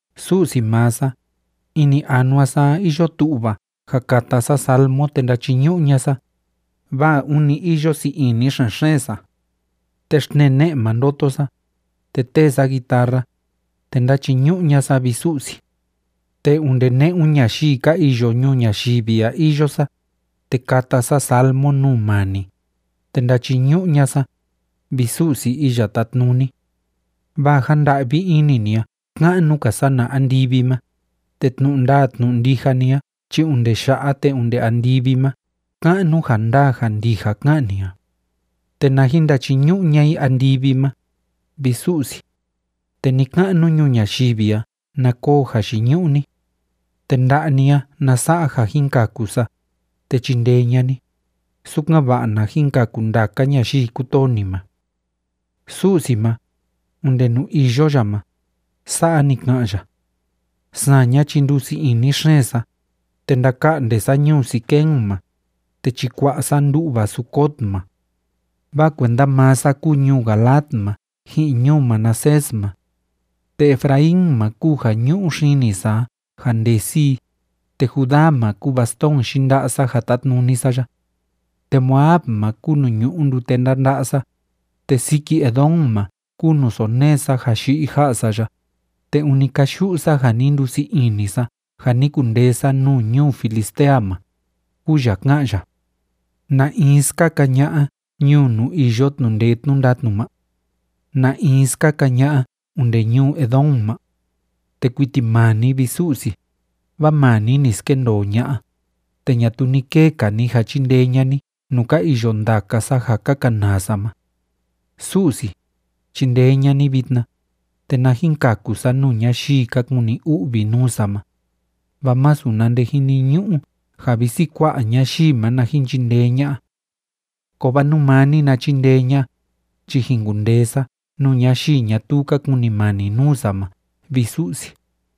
Su'si maa sa, ini anua sa a iyo tu'va ja kata sa salmo te ndachiñu'u ña'a sa, vaa ûni iyo sii ini xen‑xeen sa. Te xtnee ne'e ma ndoto sa, te tee sa guitarra, te ndachiñu'u ña'a sa, vi Su'si. Te onde ne'un ñayii ka iyo ñuu ñayivi a iyo sa, te kata sa salmo nuu maa ni, te ndachiñu'u ña'a sa, vi Su'si Iya Tátnuni. Vaa ja nda'vi ini ni a ka'nu‑ka sana andivi ma, te tnu'u ndaa tnu'u ndija ni a chi onde ya'a te onde andivi ma ka'nu ja ndaa ja ndija ká'an ni a. Te na jin ndachiñu'u ña'a i andivi ma, vi Su'si, te ni‑ka'nu ñuu ñayivi a na koo jayiñu'u ni. Te nda'a ni a na sa'a ja jin kaku sa, te chindee ña'a ni, sukan‑va'a na jin kaku ndaka ñayii kútoo ni ma. Su'si ma, onde nuu iyo ya ma, sa'a ni ka'an ya: “Saña chi ndusii ini xeen sa, te ndaka'nde sa ñuu Siquem ma, te chikua'a sa ndu'va Sucot ma. Vaa kuenda maa sa kúu ñuu Galaad ma ji'in ñuu Manasés ma. Te Efraín ma kúu ja ñu'u xini sa a ja ndesi i, te Judá ma kúu bastón yinda'a sa ja tátnuni sa ya. Te Moab ma kúu nuu ñu'u ndute ndánda'a sa, te siki Edom ma kúu nuu sonee sa ja yi'i ja'a sa ya, te ûni káyu'u sa ja ni ndusii ini sa ja ni kundee sa nuu ñuu Filistea ma”, kúu ya ká'an ya. ¿Na in skaka ña'a ñuu nuu iyo tnu'u ndee tnu'u ndatnu ma? ¿Na in skaka ña'a onde ñuu Edom ma? Te kuiti maa ni, vi Su'si, vaa maa ni ni skendoo ña'a, te ñatuu ni kee‑ka ni ja chindee ña'a ni nuu ka iyo ndaka sa ja ka kanaa sa ma. Su'si, chindee ña'a ni vitna, te na jin kaku sa nuu ñayii ka kuni u'vi nuu sa ma, vaa masu na nde jiniñu'u ja visi kua'a ñayii ma na jin chindee ña'a. Kovaa nú maa ni na chindee ña'a, chi jin kundee sa nuu ñayii ñatuu ka kunimani nuu sa ma, vi Su'si.